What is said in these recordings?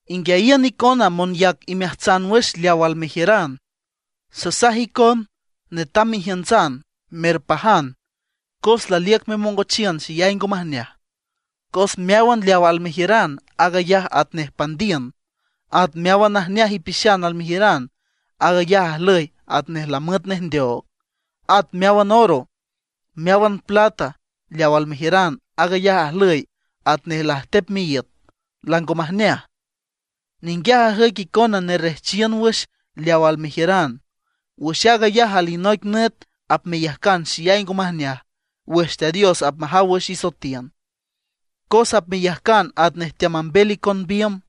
¡Inguiayiün icona monyac imeajtsan wüx leaw almejiüran! Sanasaj icon, netam mejiüntsan, merpajan, cos laliüc memongochiün xeyay ngo majneaj. Cos meáwan leaw almejiüran, aag ayaj atnej pandiün, at meáwan najneaj ipixan almejiüran, aag ayaj ajlüy atnej lamüet nej ndeoog. At meáwan oro, meáwan plata leaw almejiüran, aag ayaj ajlüy atnej lajtep miíüt, lango majneaj. Ninguiaj ajüic icona nerrejchiün wüx leaw almejiüran. Wüx aag ayaj alinoic nüt apmeyajcan xeyay ngo majneaj wüx Teat Dios apmajaw wüx isoetiün; cos apmeyajcan atnej teamambel icon biümb.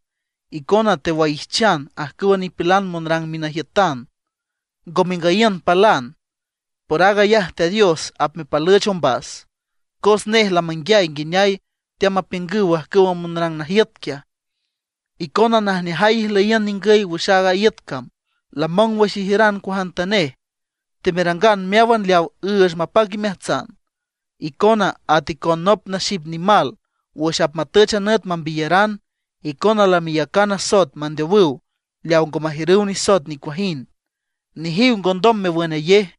Icona tewaijchan ajcüwa nipilan monrang minajiütan, ngo mengüyiün palan, por aag ayaj Teat Dios apmepalüch ombas, cos nej lamanguiay nguineay teamapiüngüw ajcüwa monrang najiüt quiaj. Icona najneajay ijlüyiün ningüy wüx aaga iüt cam, lamong wüx ijiüran cuajantanej; temerangan meáwan leaw üüch mapac imeajtsan. Icona at icon nop naxip nimal wüx apmatüch a nüt apmembiyaranan. Icona lameyacan asoet mandeowüw leawa ngo majiürüw nisoet nicuajind. ¡Nejiw ngondom mewünayej!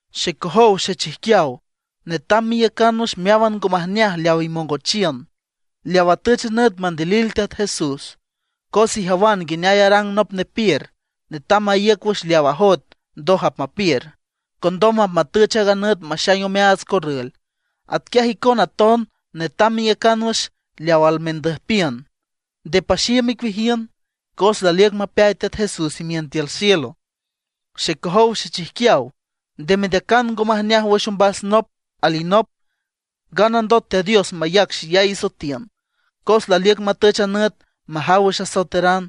Xecojow xechijquiaw, netam meiücan wüx meáwan ngo majneaj leaw imongochiün, leaw atüch a nüt mandilil Teat Jesús. Cos ijawan nguineay arang nop nepiür, netam maíüc wüx leaw ajoet ndoj apmapiür. Condom apmatüch aaga nüt maxaing omeaats corrül. Atquiaj icona aton netam meiücan wüx leaw almendüjpiün, nde paxiüm icueajiün; cos laliüc mapeay Teat Jesús imiün tiül cielo. Xecojow xechijquiaw, nde mendeacan ngo majneaj wüx ombas nop alinop, nganandot Teat Dios mayac xeyay isoetiün, cos laliüc matüch a nüt majaw wüx asoeteran.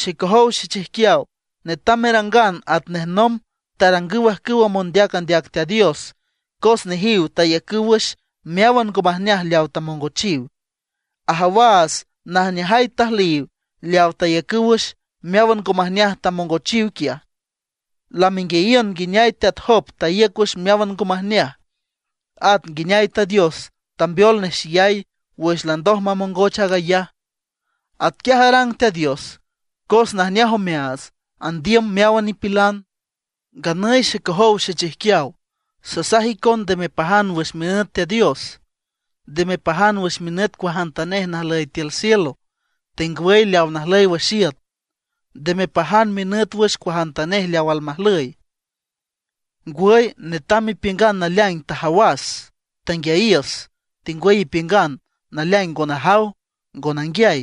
Xecojow xechijquiaw, netam merangan atnej nomb tarangüw ajcüwa mondeac andeac Teat Dios, cos nejiw taiücüw wüx meáwan ngo majneaj leawa tamongochiw. Ajawaats najneajay tajlüyiw leawa taiücüw wüx meáwan ngo majneaj tamongochiw quiaj. Lamenguiayiün nguineay teat Job taíüc wüx meáwan ngo majneaj, at nguineay Teat Dios tambeol nej xeyay wüx landoj mamongoch aag ayaj. Atquiaj arang Teat Dios cos najneaj omeaats, andiüm meáwan nipilan. Nganüy xecojow xechijquiaw, sasaj icon nde mepajan wüx minüt Teat Dios. Nde mepajan wüx minüt cuajantanej najlüy tiül cielo, tengwüy leaw najlüy wüx iüt. Nde mepajan minüt wüx cuajantanej leaw almajlüy. Ngwüy netam mepiüngan naleaing tajawas, tanguiayiüs; tengwüy ipiüngan naleaing ngo najaw ngo nanguiay.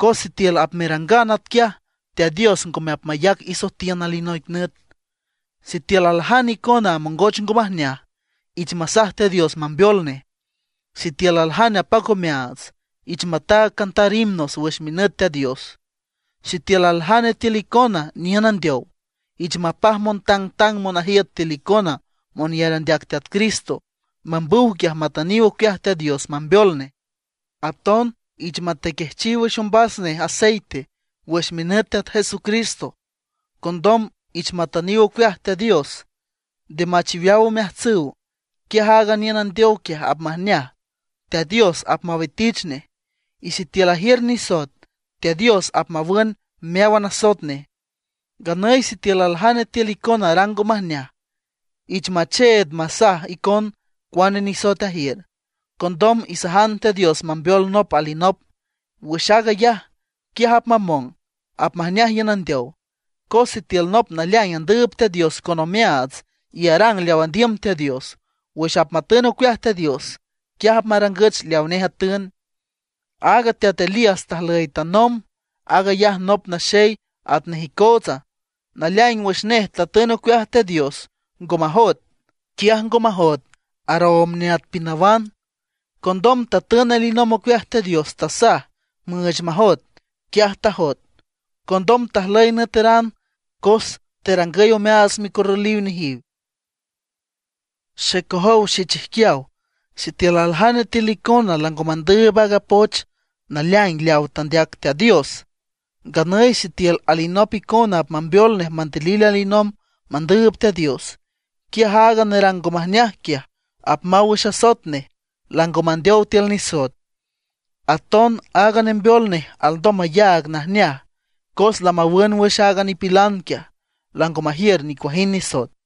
Cos sitiül apmerangan atquiaj Teat Dios ngome apmayac isoetiün alinoic nüt. Sitiül aljane icona amongoch ngo majneaj, ich masaj Teat Dios mambeol nej; sitiül aljane apac omeaats, ich mataag cantar himnos wüx minüt Teat Dios. Sitiül aljane tiül icona niün andeow, ich mapaj montangtang monajiüt tiül icona monyar andeac Teat Cristo, mambüw quiaj matüniw ocueaj Teat Dios mambeol nej. Aton ich matequejchiw wüx ombas nej aceite wüx minüt Teat Jesucristo. Condom ich matüniw ocueaj Teat Dios, nde machiweaw omeajtsüw. Quiaj aaga niün andeow quiaj apmajneaj, Teat Dios apmawitich nej, y sitiül ajiür nisoet Teat Dios apmawün meáwan asoet nej. Nganüy sitiül aljane tiül icona arang ngo majneaj, ich macheed masaj icon cuane nisoet ajiür. Condom isajan Teat Dios mambeol nop alinop wüx aag ayaj; quiaj apmamong, apmajneaj iün andeow. Cos sitiül nop naleaing andüüb Teat Dios con omeaats y arang leaw andiüm Teat Dios, wüx apmatün ocueaj Teat Dios, quiaj apmarangüch leaw nej atün. Aaga teat Elías tajlüy tanomb, aag ayaj nop naxey atnej icootsa. Naleaing wüx nej tatün ocueaj Teat Dios ngo majoet, quiaj ngo majoet aroomb neat pinawan. Condom tatün alinomb ocueaj Teat Dios, tasaj müüch majoet, quiaj tajoet. Condom tajlüy nüeteran cos terangüy omeaats micorrüliw nejiw. Xecojow xechijquiaw, sitiül aljane tiül icona lango mandüüb aaga poch naleaing leaw tandeac Teat Dios, nganüy sitiül alinop icona apmambeol nej mandilil alinomb mandüüb Teat Dios, quiaj aaga nerang ngo majneaj quiaj apmaw wüx asoet nej, lango mandeow tiül nisoet. Aton aaga nembeol nej alndom mayaag najneaj cos lamawün wüx aaga nipilan quiaj, lango majiür nicuajind nisoet.